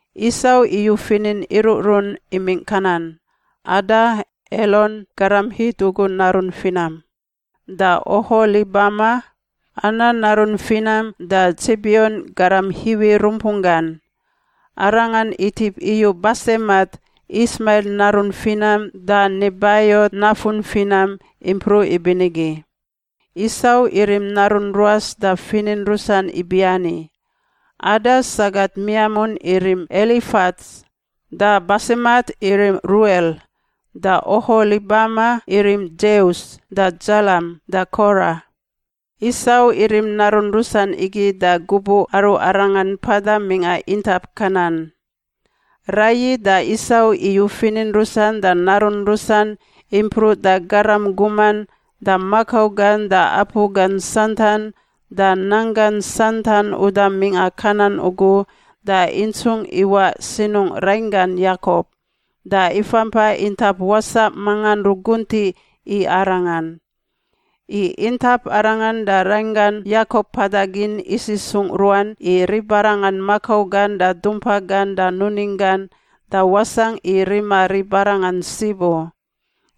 Isau iyu finin iruꞌrun imingꞌ Kanan: Ada, Elon garam Hit ugu narun finam, da Oholibama, Ana narun finam da Tsibion garam Hiwi rumpunggan. Arangan itip iyu Basemat, Ismail narun finam da Nebaiot nafun finam, impruꞌ ibinigi. Isau irim narun ruas da finin rusan ibiani, Ada sagat miamun irim Elifats, da Basemat irim Ruel. Da Oholibama irim Dzeus da Dzalam da Kora. Isau irim narun rusan igi da gubuꞌ aru arangan mpada mingꞌa intap Kanan. Raiyi da Isau iyu finin rusan da narun rusan, impruꞌ da garam guman, da makau gan da apu gan santan, da nanggan santan uda mingꞌa Kanan ugu da intsungꞌ iwaꞌ sinungꞌ rainggan Yakop, da ifampa intap wasaꞌ mangan ruguntiꞌ i arangan. I intap arangan da rainggan Yakop mpada gin isisungꞌ ruan i ribarangan makau gan da dumpa gan da nuning gan, da wasangꞌ i rima ribarangan sib u.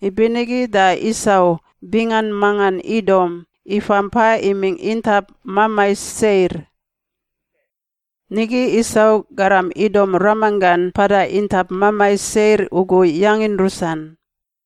Ibinigi da Isau (bingan mangan Idom) ifa mpa imingꞌ intap mamai Seir. Nigi Isau, garam Idom ramanggan mpada intap mamai Seir ugu, yangin rusan: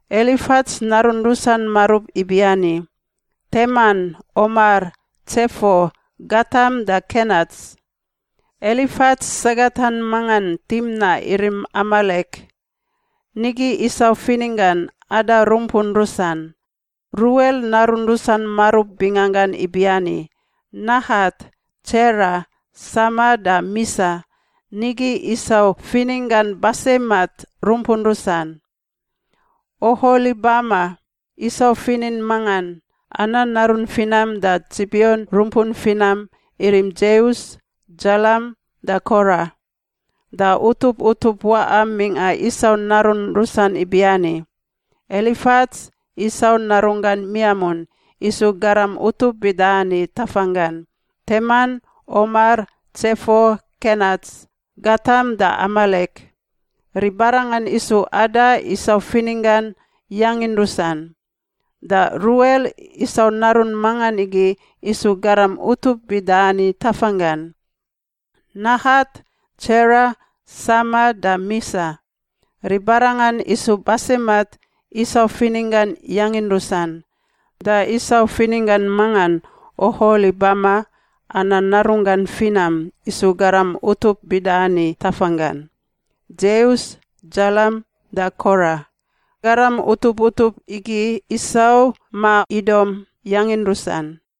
Elifats narun rusan marub ibiani: Teman, Omar, Tsefo, Gatam da Kenats. Elifats sagatan mangan Timna irim Amalek. Nigi Isau fininggan Ada rumpun rusan. Ruel narun rusan marub binganggan ibiani: Nahat, Tsera, Sama da Misa. Nigi Isau fininggan Basemat rumpun rusan. Oholibama, Isau finin mangan, Ana narun finam da Tsibion rumpun finam, irim Dzeus, Dzalam da Kora. Da utup utup waꞌa mingꞌa Isau narun rusan ibiani: Elifats, Isau narunggan miamun, isu garam utup bida ani tafanggan: Teman, Omar, Tsefo, Kenats, Gatam da Amalek. Ribarangan isu Ada, Isau fininggan, yangin rusan. Da Ruel, Isau narun mangan igi, isu garam utup bida ani tafanggan: Nahat, Tsera, Sama da Misa. Ribarangan isu Basemat, Isau fininggan, yangin rusan. Da Isau fininggan mangan Oholibama, Ana narunggan finam, isu garam utup bida ani tafanggan: Dzeus, Dzalam da Kora. Garam utup utup igi Isau (ma Idom) yangin rusan.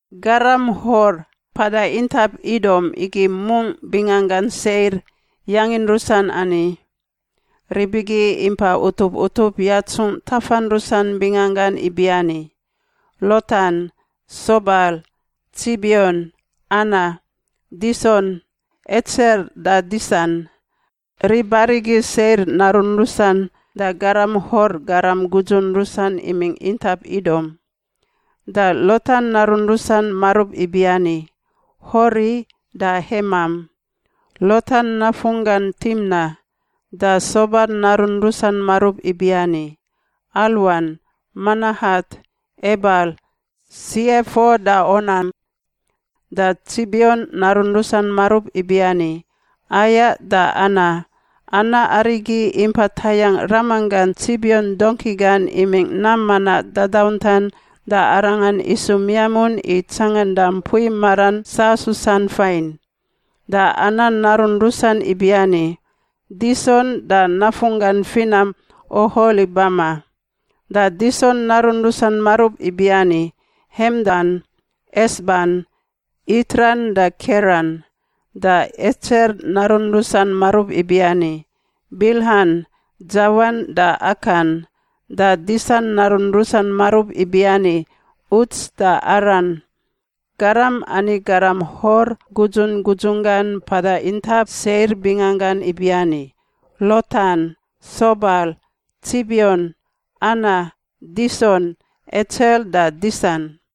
Garam Hor mpada intap Idom igi mungꞌ binganggan Seir yangin rusan ani. Rib igi impa utup utup yatsungꞌ tafan rusan binganggan ibiani: Lotan, Sobal, Tsibion, Ana, Dison, Etser da Disan. Rib arigi Seir narun rusan da garam Hor garam gudzun rusan imingꞌ intap Idom. Da Lotan narun rusan marub ibiani: Hori da Hemam. Lotan nafunggan Timna. Da Sobal narun rusan marub ibiani: Alwan, Manahat, Ebal, Siefo da Onam. Da Tsibion narun rusan marub ibiani: Aia da Ana. Ana arigi impa tayangꞌ ramanggan Tsibion dongki gan imingꞌ nam manaꞌ dadauntan da arangan isu miamun i tsanganda mpui maran sasusan fain. Da Ana narun rusan ibiani: Dison da nafunggan finam Oholibama. Da Dison narun rusan marub ibiani: Hemdan, Esban, Itran da Keran. Da Etser narun rusan marub ibiani: Bilhan, Dzawan da Akan. Da Disan narun rusan marub ibiani: Uts da Aran. Garam ani garam Hor gudzun gudzunggan mpada intap Seir binganggan ibiani: Lotan, Sobal, Tsibion, Ana, Dison, Etser da Disan.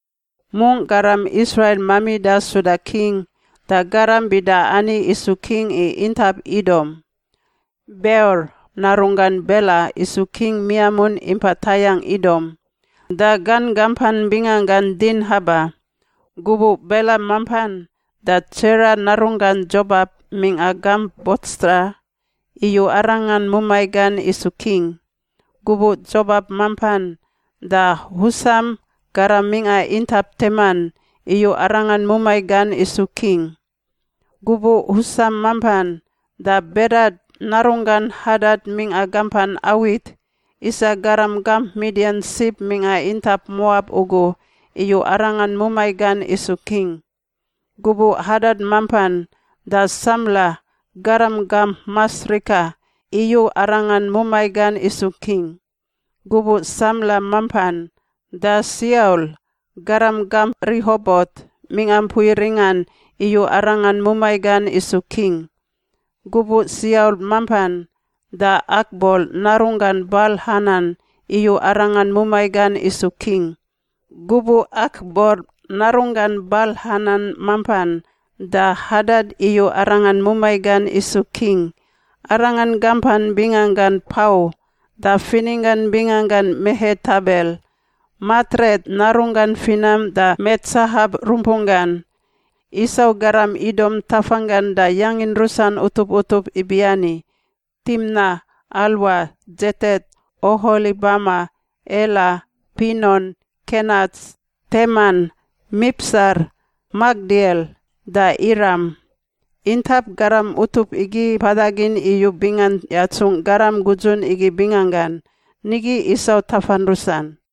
Mungꞌ garam Israil mamida suda king, da garam bida ani isu king i intap Idom: Beor narunggan Bela isu king miamun impa tayangꞌ Idom. Da gan gampan binganggan Dinhaba. Gubuꞌ Bela mampan, da Tsera narunggan Dzobap mingꞌa gamp Botsra iyu arangan mumai gan isu king. Gubuꞌ Dzobap mampan, da Husam, garam mingꞌa intap Teman, iyu arangan mumai gan isu king. Gubuꞌ Husam mampan, da Bedad narunggan Hadad mingꞌa gampan Awit, isa garam gamp Midian sib mingꞌa intap Moab ugu, iyu arangan mumai gan isu king. Gubuꞌ Hadad mampan, da Samla, garam gamp Masrika, iyu arangan mumai gan isu king. Gubuꞌ Samla mampan, da Siaul, garam gamp Rihobot mingꞌa mpui ringan, iyu arangan mumai gan isu king. Gubuꞌ Siaul mampan, da Akbor narunggan Bal-Hanan iyu arangan mumai gan isu king. Gubuꞌ Akbor narunggan Bal-Hanan mampan, da Hadad iyu arangan mumai gan isu king. Arangan gampan binganggan Pau, da fininggan binganggan Mehetabel, Matret narunggan finam da Metsahap rumpunggan. Isau garam Idom tafanggan da yangin rusan utup utup ibiani: Timna, Alwa, Dzetet, Oholibama, Ela, Pinon, Kenats, Teman, Mipsar, Makdiel da Iram. Intap garam utup igi mpada gin iyu bingan yatsungꞌ garam gudzun igi binganggan. Nigi Isau tafan rusan.